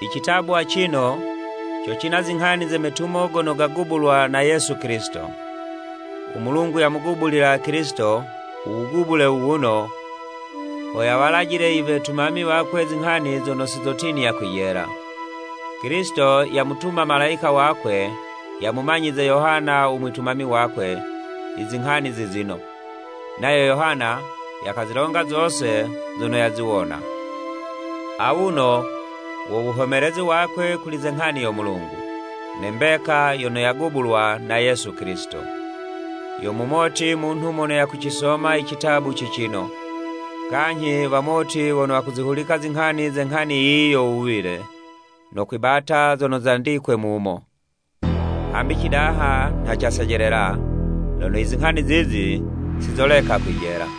Citabu acino, co cina zinghani ze metumo gono gagubulwa na Yesu Kilisito. U Mulungu yamugubulila Kilisito u wugubule wu wuno, ho yawalajile i wetumami wakwe zinghani zono si zotinya kwijela. Kilisito yamutuma malayika wakwe yamumanyize Yohana u mwitumami wakwe, i zinghani zizino, nayo Yohana yakazilonga zose zono yaziwona. Awuno wo wuhomelezi wakwe kuli ze nghani yo Mulungu, ne mbeka yono yagubulwa na Yesu Kilisito. Yo mumoti munhu mono yakucisoma i citabu cicino, kanyhi wamoti wono wakuzihuliciza zinghani ze nghani yiyi yo wuwile, no kwibata zono zandicigwe mumu! Hambi cidaha nha casejelela, lono i zinghani zizi sizoleka kwijela.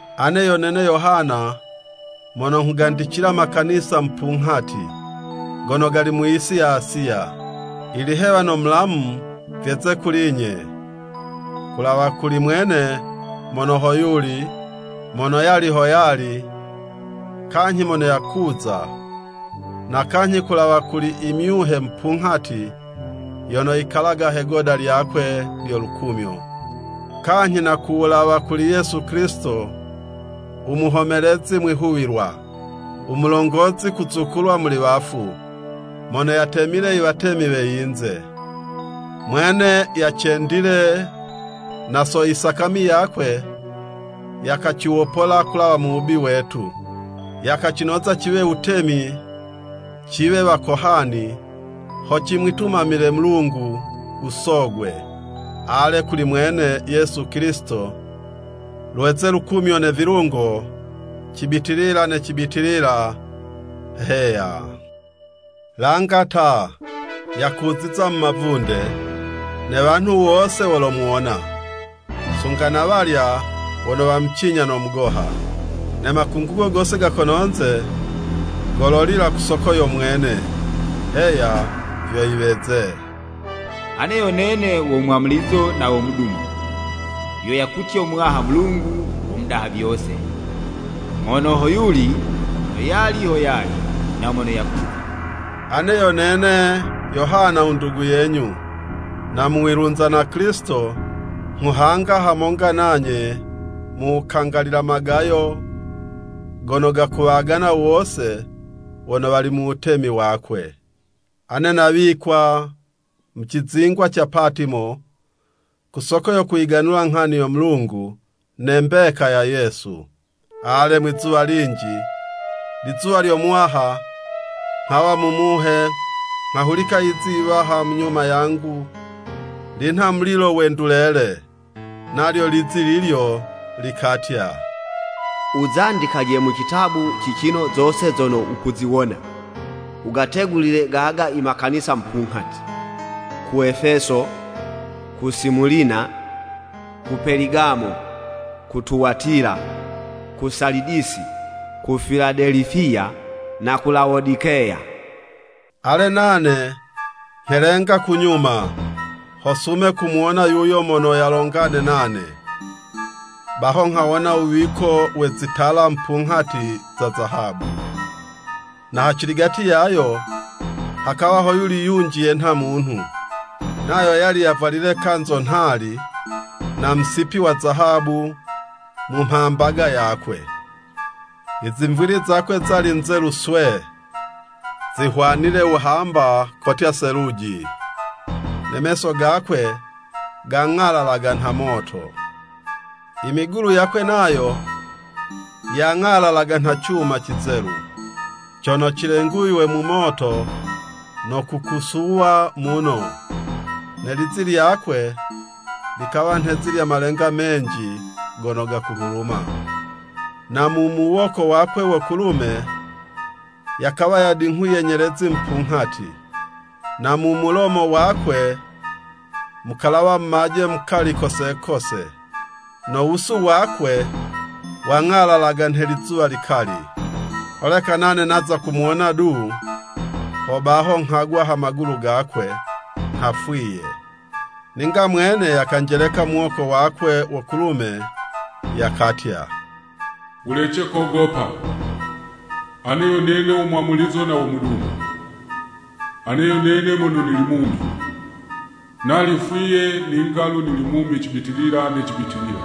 Ane yo nene Yohana mono nghugandicila makanisa mupunghati, gono gali mu yisi ya Asiya. Ilihewa no mulamu vyeze kuli'nye ku wulawa kuli mwene mono hoyuli, mono yali ho yali, kanyhi mono yakuza, na kanyhi ku wulawa kuli i myuhe mupunghati yono yikalaga he'goda lyakwe lyo lukumyo, kanyhi na ku wulawa kuli Yesu Kilisito, u muhomelezi mwihuwilwa, u mulongozi kuzukulwa muli wafu, mono yatemile i watemi we yinze. Mwene yacendile, na so isakami yakwe, yakaciwopola kulawa mu wubi wetu, yakacinoza ciwe wutemi, ciwe wakohani, ho cimwitumamilo Mulungu u Sogwe. Ale, kuli mwene Yesu Kilisito, lweze lukumyo ne vilungo, cibitilila ne cibitilila! Heya. Langa ta! Yakuziza mu mavunde! Ne wanhu wose wolomuwona, sunga na walya wono wamucinya no mugoha. Ne makungugo gose ga kono'nze, gololila ku soko yo mwene. Heya! Vyo yiweze. “Ane yo nene wo Mwamulizo na wo Mudumo,” vyo yakutya Muwaha Mulungu u Mudaha Vyose, mono hoyuli, mono yali ho yali, na mono yakuza. Ane yo nene Yohana u ndugu yenyu, na mu wilunza na Kilisito, nghuhanga hamonga nanye mu wukangalila magayo gono gakuwagana wose wono wali mu wutemi wakwe. Ane nawikwa mu cizingwa ca Patimo, ku soko yo kuyiganula nghani yo Mulungu ne mbeka ya Yesu. Ale, mwizuwa linji, lizuwa lyo Muwaha, nghawa mu Muhe, nghahulika yizi yiwaha mu nyuma yangu linha mulilo we ndulele. Nalyo lizi lilyo likatya, “Wuzandikaje mu citabu cicino zose zono wukuziwona, wugategulile gaga i makanisa mupunghati, ku Efeso, ku Simulina, ku Peligamo, ku Tuwatila, ku Salidisi, ku Filadelifiya, na ku Lawodikeya.” Ale, nane nghelenga ku nyuma, ho sume kumuwona yuyo mono yalongane nane, baho nghawona wuwiko we zitala mupunghati za zahabu, na haciligati yayo, hakawa hoyuli yunji yenha munhu, nayo yali yavwalile kanzo nhali na musipi wa zahabu mu mhambaga yakwe. I zimvwili zakwe zali nzelu swee, zihwanile wuhamba, kotya seluji, ne meso gakwe gang'alalaga nha moto, i migulu yakwe nayo, yang'alalaga nha cuma cizelu, cono cilenguywe mu moto no kukusuwa muno, ne lizi lyakwe likawa nhe'zi lya malenga menji gono gakuhuluma. Na mu muwoko wakwe wo kulume, yakawa yadinghuye nyelezi mupunghati, na mu mulomo wakwe, mukalawa mumaje mukali kose kose. No wusu wakwe wang'alalaga nhe lizuwa likali. Holeka nane naza kumuwona du, hobaho nghagwa ha magulu gakwe nha fwiye. Ninga mwene yakanjeleka muwoko wakwe wo kulume, yakatya, “Wulece kogopa! Ane yo nene wo Mwamulizo na wo Mudumo. Ane yo nene mono nili mumi! Nali fwiye, ninga'lu nili mumi cibitilila ne cibitilila.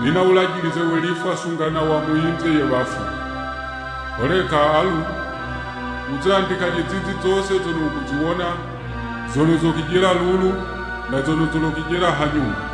Nina wulajilize we lifwa sunga na wa mu yinze ye wafu. Holeka, alu wuzandikaje zizi zose zono wukuziwona, zono zokwijela lulu, na zono zolokwijela hanyuma.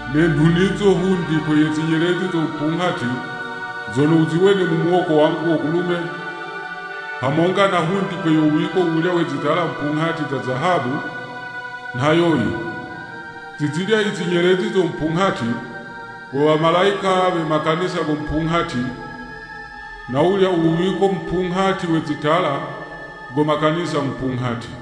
Ne nhunizo hundikwe ye zinyelezi zo mupunghati zono wuziwene mu muwoko wangu wo kulume, hamonga na hundikwe yo wuwiko wu wulya we zitala mupunghati za zahabu, nha yoyi, zi zilya i zinyelezi zo mupunghati, wo wamalayika we makanisa go mupunghati, na wulya u wuwiko mupunghati we zitala, go makanisa mupunghati.”